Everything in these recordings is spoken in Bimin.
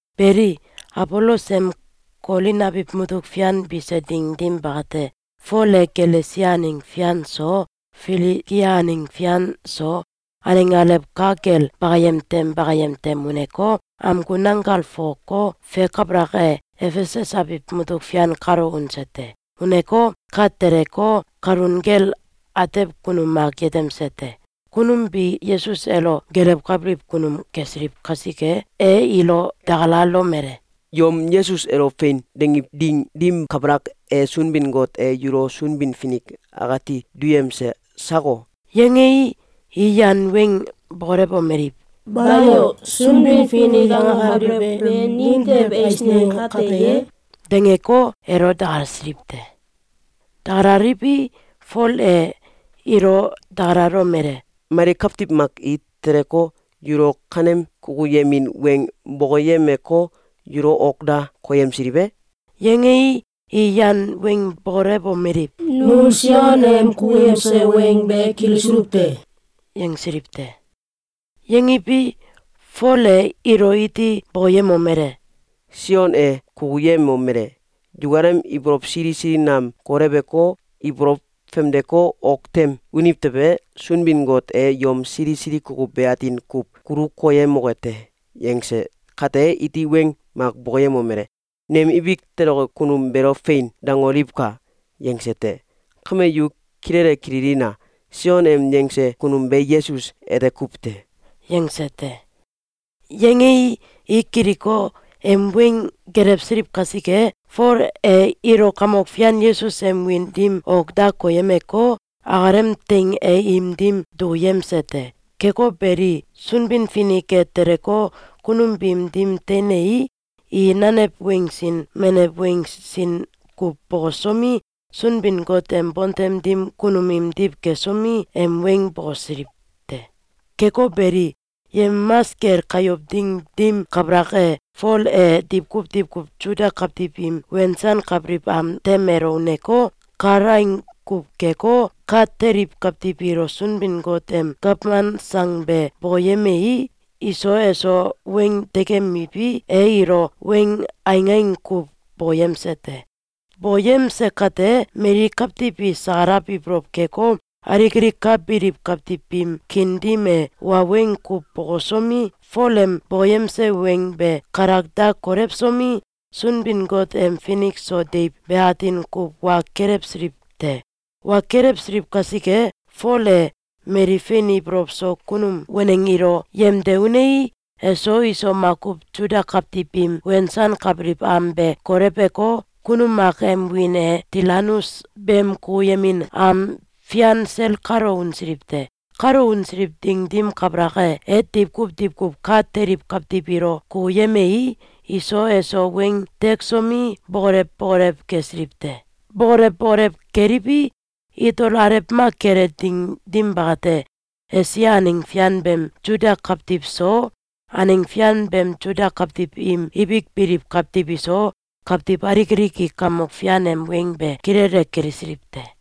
Beli, Abolos em Kolin abiw mutuk fian bise ding dim bakate, Fol e Galesia aneng fian so, Filigia aneng fian so, aneng alew ka kel bakayem tem bakayem tem uneko, amgu nanggal fokoko, fe kabalak e, Efesus abiw mutuk fian kalo unse te. Uneko, ka teleko, kalun kel atew kunum mak yetemse te. Kunum bi Yesus elo gelewkabiliw kunum kesiliw kasike, e ilo dakalalomele: “Yom Yesus elo “Fein!”, dangiw ding dim kabalak e, Sunbin-Got e yulo Sunbin-Finik akati duyemse sako?”, yangei, i yan weng bokolewomeliw: “Bayo! ‘Sunbin-Finik’, angakabelew be nimtew eisneng kate ye?”, dangeko, elo dakalasiliw te. Dakalaliwi, Fol e ilo dakalalomele: “Mali kawtiw mak i teleko, yulo kanem kukuyemin weng bokoyemeko, yulo ok da koyemsiliw e?”, yangei, i yan weng bokolewomeliw: “Nu Sion em kukuyemse weng be kilisuluw te.”, yangsiliw te. Yangiwi, Fol e ilo iti bokoyemomele: “Sion e kukuyemomele: ‘Yukalem ibolow sili sili nam koleweko, ibolow famdeko, ok tem uniw tewe, Sunbin-Got e yom sili sili kukuw be atin kuw kulu koyemoke te.’, yangse kate, iti weng mak bokoyemomele: ‘Nem ibik toloke kunum beelo ‘Fein!’, dangoliwka!’, yangse te. Kame yu kilele kililina! Sion em yangse kunum be Yesus ete kuw te!”, yangse te. Yangei, i kiliko, em weng gelewsiliw kasike, Fol e ilo Kamok Fian Yesus em wiin dim ok da koyemeko, akalem teing e im dim dukuyemse te. Keko beli, Sunbin-Finik e teleko, kunum biim dim teinei, i nanew weng sin nanew weng sin kuw bokosomi, Sunbin-Got em bontem dim kunum imdiw kesomi, em weng bokosiliw te. Keko beli, yemamas kel kayow ding dim kabalak e, Fol e diwkuw diwkuw Suda kawtiw im wensankabiliw am tem elo uneko, kalaing kuw keko, ka teliw kawtiw ilo Sunbin-Got em gawman sang be bokoyemei, iso eso weng tekemiwi, e ilo weng aingaing kuw bokoyemse te. Bokoyemse kate, mali kawtiw i sakalaw ibolow keko, alik alik ka biliw kawtiw biim kiin dim e, wa weng kuw bokosomi, Fol em bokoyemse weng be kalak da kolewsomi, Sunbin-Got em finik so deiw be atin kuw wa kelewsiliw te. Wa kelewsiliw kasike, Fol e mali fein ibolow so kunum waneng ilo yemde unei, eso iso makuw Suda kawtiw biim wensankabiliw am be koleweko, kunum mak em wiin e Tilanus beem kukuyemin am fian sel kalo unsiliw te. Kalo unsiliw ding dim kabalak e, e diwkuw diwkuw ka teliw kawtiw ilo kukuyemei, iso eso weng teksomi, bokolew bokolew kesiliw te. Bokolew bokolew keliwi, itol alew mak kele ding dim bakate, Esia aneng fian beem Suda kawtiw so, aneng fian beem Suda kawtiw im ibik biliw kawtiw iso, kawtiw alik alik i Kamok Fian em weng be kilele kilisiliw te.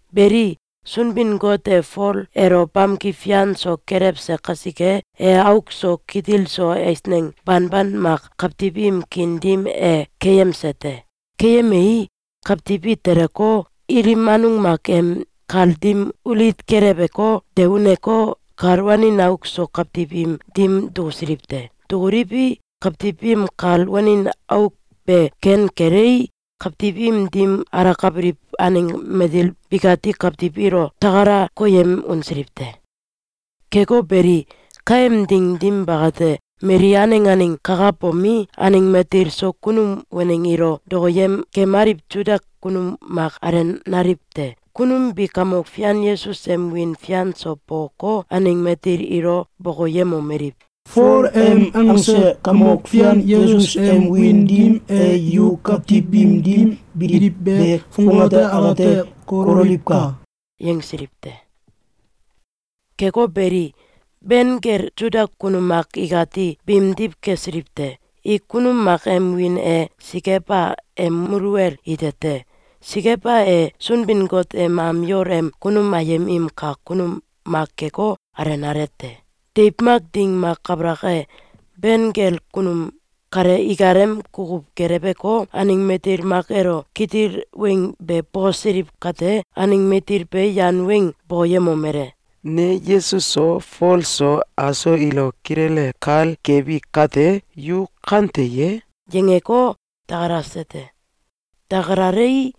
Beli, Sunbin-Got e Fol elo bamki fian so kelewse kasike, e auk so kitil so eisneng banban mak kawtiw im kiin dim e keyemse te. Keyemei, kawtiw i teleko, ilim anung mak em kal dim ulit keleweko, de uneko, kal wanin auk so kawtiw im dim dukusiliw te. Dukuliwi, kawtiw biim kal wanin auk be ken kelei, kawtiw im dim alakabiliw aneng matil bikati kawtiw ilo takala koyem unsiliw te. Keko beli, kaem ding dim bakate, mali aneng aneng kakabomi, aneng matil so kunum waneng ilo dokoyem kemaliw Suda kunum mak alenaliw te. Kunum bi Kamok Fian Yesus em wiin fian so bokoko, aneng matil ilo bokoyemomeliw: “Fol em angse Kamok Fian Yesus em wiin dim e yu kawtiw biim dim biliw be fongate akate kololiwka!”, yangsiliw te. Keko beli, ben kel Suda kunum mak ikati biimdiw kesiliw te. I kunum mak em wiin e Sikeba em muluwel ite te. Sikeba e Sunbin-Got em am yol em kunum ayem im kak kunum mak keko, alenale te. Deiw mak ding mak kabalak e, ben kel kunum kale ikalem kukuw geleweko, aneng matil mak elo kitil weng be bokosiliw kate, aneng matil be yan weng bokoyemomele: “Ne Yesus so, Fol so, aso ilo kilele kal kebi kate, yu kante ye?”, yangeko, dakalase te. Dakalalei,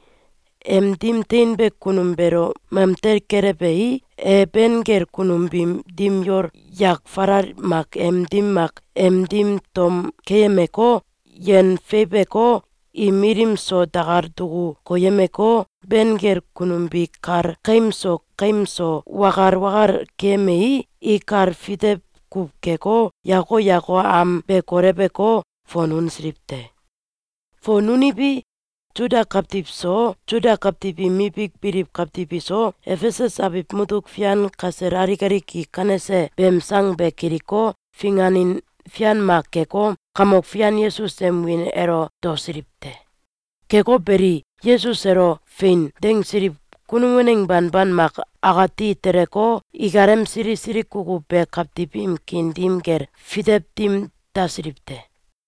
em dim teinbe kunum beelo mamtel kelewei, e ben kel kunum biim dim yol yak falal mak em dim mak em dim tom keyemeko, yen feiweko, im ilim so dakal duku koyemeko, ben kel kunum bi kal kaim so kaim so wakal wakal keyemei, i kal fitew kuw keko, yako yako am be koleweko, fon unsiliw te. Fon uniwi, Suda kawtiw so, Suda kawtiw im ibik biliw kawtiw iso, Efesus abiw mutuk fian kasel alik alik i kanese beem sang be kiliko, finganin fian mak keko, Kamok Fian Yesus em wiin elo daosiliw te. Keko beli, Yesus elo “Fein!”, dangsiliw kunum waneng banban mak akati teleko, ikalem sili sili kukuw be kawtiw im kiin dim kel fitew dim dasiliw te.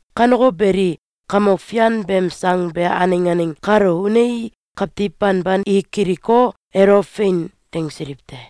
Kaneko beli, Kamok Fian beem sang be aneng aneng kalo unei, kawtiw banban i kiliko, elo “Fein!”, dangsiliw te.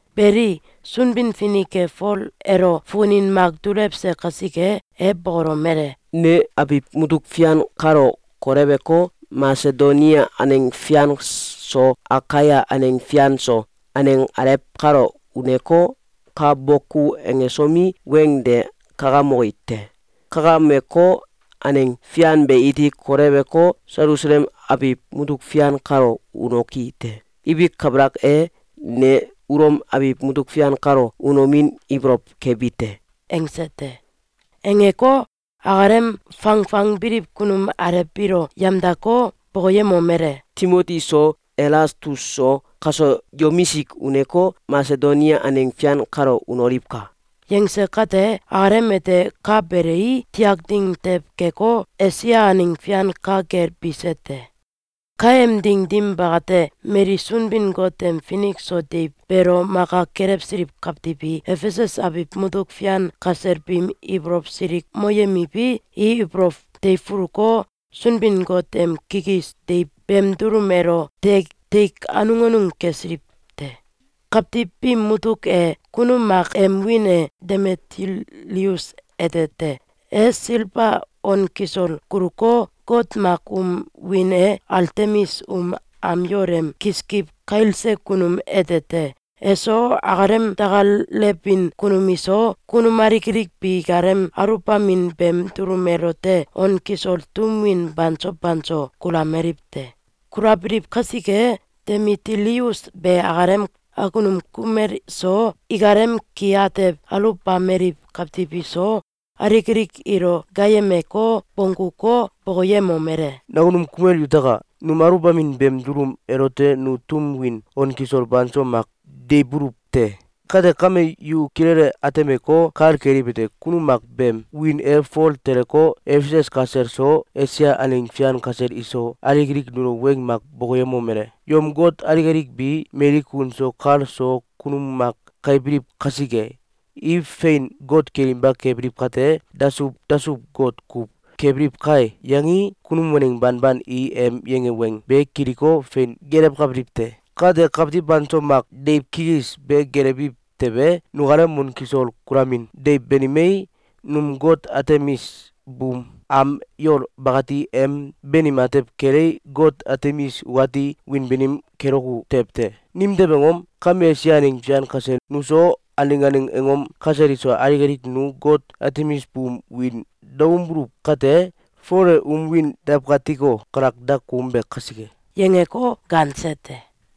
Beli, Sunbin-Finik e Fol elo fukunin mak dulewse kasike, e bokolomele: “Ne abiw mutuk fian kale koleweko, Masedonia aneng fian so, Akaia aneng fian so, aneng alew kalo uneko, ka boku angesomi, weng de kakamoki te. Kakameko, aneng fian be iti koleweko, Selusalem abiw mutuk fian kalo unoki te. Ibik kabalak e, ne Ulom abiw mutuk fian kalo unomin ibolow kebi te.”, angse te. Angeko, akalem fangfangbiliw kunum alew biilo yamdako, bokoyemomele: “Timoti so, Elastus so, kaso yomisik uneko, Masedonia aneng fian kalo unoliwka!”, yangse kate, akalem ete ka belei, tiak ding tew keko, Esia aneng fian ka kel bise te. Kaem ding dim bakate, mali Sunbin-Got em finik so deiw beelo maka kelewsiliw kawtiw i Efesus abiw mutuk fian kasel biim ibolow silikmoyemiwi, i ibolow teifuluko, Sunbin-Got em kikis deiw beem dulum elote tek anung anung kesiliw te. Kawtiw biim mutuk e, kunum mak em wiin e Demitilius ete te. E silba on kisol kuluko, got mak um wiin e Altemis um am yol em kiskiw kailse kunum ete te. Eso, akalem dakalewbin kunum iso, kunum alik alik bi ikalem aluwbamin beem dulum elote on kisol tum win banso banso kulameliw te. Kulabiliw kasike, Demitilius be akalem akunum kumel so, ikalem ki atew aluwbameliw kawtiw iso, alik alik ilo gaayemeko, bongguko, bokoyemomele: “Nakunum kumel yutaka! Num aluwbamin beem dulum elote nu tum win on kisol banso mak deiwbuluw te. Kate kame, yu kilele atemeko, kal keliwete: Kunum mak beem wiin e Fol teleko, Efesus kasel so, Esia aneng fian kasel iso, alik alik nulo weng mak bokoyemomele: ‘Yom got alik alik bi, mali kun so kal so kunum mak kailbiliw kasike, i fein got kelinba kebiliw kate, dasuw dasuw-got kuw kebiliw kai!’, yangei, kunum waneng banban i em yange weng be kiliko, fein gelewkabiliw te. Kate, kawtiw banso mak deiw kikis be gelewiw tewe, nukalem on kisol kulamin deiw banimei, num got Altemis buum am yol bakati em banim atew kelei, got Altemis ukati wiin banim keloku tew te. Nimtew angom? Kame Esia aneng fian kasel nu so, aneng aneng angom kasel iso, alik alik nu got Altemis buum wiin daoumbuluw kate, Fol e um wiin dawkatiko, kalak da koumbe kasike.”, yangeko, gaanse te.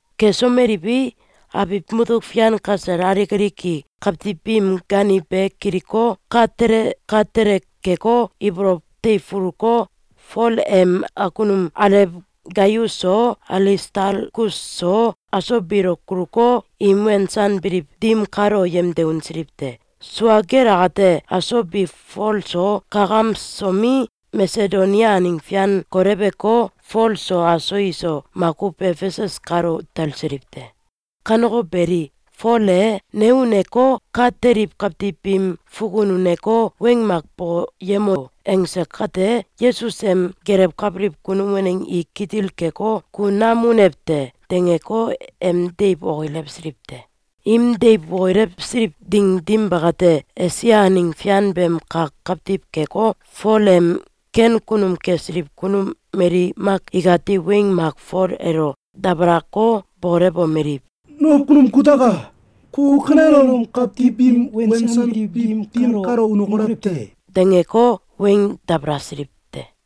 Kesomeliwi, abiw mutuk fian kasel alik alik i kawtiw biim gaaniw be kiliko, ka tele ka tele keko, ibolow teifuluko, Fol em akunum alew Gaius so, Alistalkus so, aso biilo kuluko, im wensanbiliw dim kalo yemde unsiliw te. (Sua kel akate, aso bi Fol so kakamsomi, Masedonia aneng fian koleweko, Fol so aso iso makuw Efesus kalo talsiliw te.) Kaneko beli, Fol e “Ne uneko, ka teliw kawtiw biim fukun uneko, weng mak bokoyemo!”, angse kate, Yesus em gelewkabiliw kunum waneng i kitil keko, “Ku nam unew te!”, dangeko, em deiw okilewsiliw te. Im deiw okilewsiliw ding dim bakate, Esia aneng fian beem kak kawtiw keko, Fol em ken kunum kesiliw kunum mali mak ikati weng mak Fol elo dabalako, bokolewomeliw: “Nakunum kutaka! Ku kanelom kawtiw biim wensanbiliw dim kalo unokolew te!”, dangeko, weng dabalasiliw te.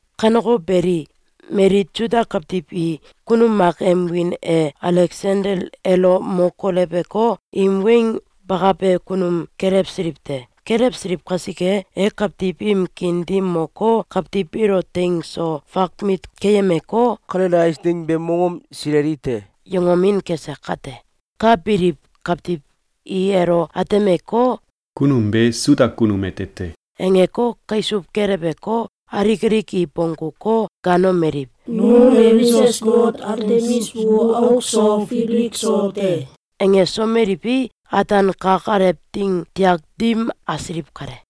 Kaneko beli, mali Suda kawtiw i kunum mak em wiin e Aleksandel elo mo koleweko, im weng bakabe kunum kelewsiliw te. Kelewsiliw kasike, e kawtiw im kiin dim moko, kawtiw biilo teing so fakmit keyemeko, “Kanele eisneng beem mongom sileli te!”, yangomin kese kate, ka biliw kawtiw i elo atemeko, “Kunum be Suda kunum ete te!”, angeko, kaisuw keleweko, alik alik i bongguko, gaanomeliw: “Num Efesus got Altemis bu auk so fibilik so te!”, angesomeliwi, ataan kak alew ding tiak dim asiliw kale.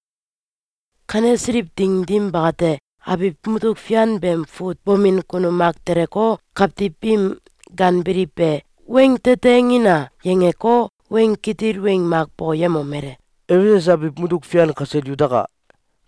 Kanesiliw ding dim bakate, abiw mutuk fian beem fut bomin kunum mak teleko, kawtiw biim gaanbiliw be “Weng tete angina!”, yangeko, weng kitil weng mak bokoyemomele: “Efesus abiw mutuk fian kasel yutaka!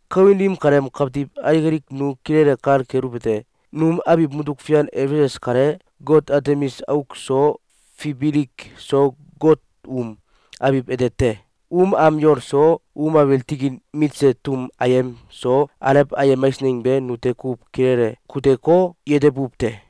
Kawin dim kaleem kawtiw alik alik nu kilele kal keluwete: Num abiw mutuk fian Efesus kale, got Altemis auk so fibilik so got um abiw ete te. Um am yol so, um abiil tikin mitse tum ayem so, alew ayem eisneng be nute kuw kilele kuteko, yetebuw te.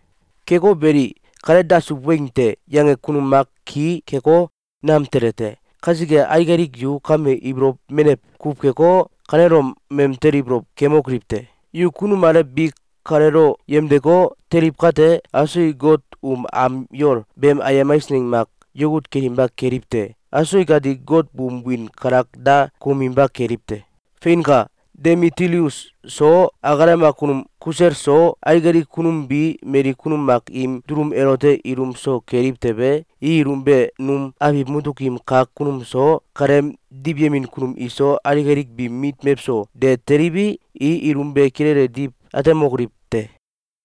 Keko beli, ‘Kale dasuw weng te!’, yange kunum mak ki keko, nam tele te. Kasike, alik alik yu kame ibolow menew kuw keko, kanelom mamtel ibolow kemokoliw te! Yu kunum alew bi kaleelo yemdeko, teliw kate, aso i got um am yol beem ayem eisneng mak yakut kelinba keliw te! Aso ikati got buum wiin kalak da kouminba keliw te! Feinka! Demitilius so, akalem akunum kusel so, alik alik kunum bi mali kunum mak im dulum elote ilum so keliw tewe, i ilum be num abiw mutuk im kak kunum so, kaleem diwyemin kunum iso, alik alik biim mit mewso de teliwi, i ilum be kilele diw atemokoliw tew te.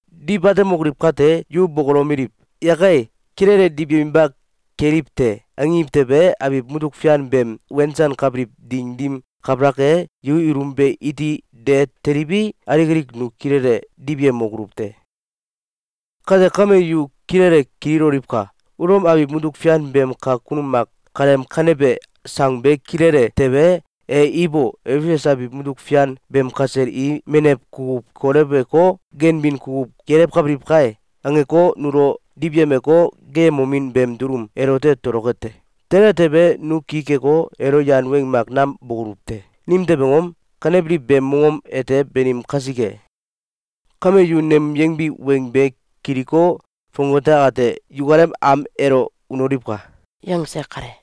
Diw atemokoliw kate, yu bokolomeliw: ‘Yakai! Kilele diwyeminba keliw te!’, angiw tewe, abiw mutuk fian beem wensankabiliw ding dim kabalak e, yu ilum be iti de teliwi, alik alik nu kilele diwyemokoluw te. Kate kame, yu kilele kililoliwka! Ulom abiw mutuk fian beem kak kunum mak kaleem kanebe sang be kilile tewe, e ‘Ibo! Efesus abiw mutuk fian beem kasel i menew kukuw koleweko, ganbin kukuw gelewkabiliw kai!’, angeko, nulo diwyemeko, geeyemomin beem dulum elote toloke te. Tele tewe, nu ki keko, elo yan weng mak nam bokoluw te. Nimtew angom? Kanebiliw beem mongom ete banim kasike. Kame yu nem yangbi weng be kiliko, fongate akate yukalem am elo unoliwka!”, yangse kale.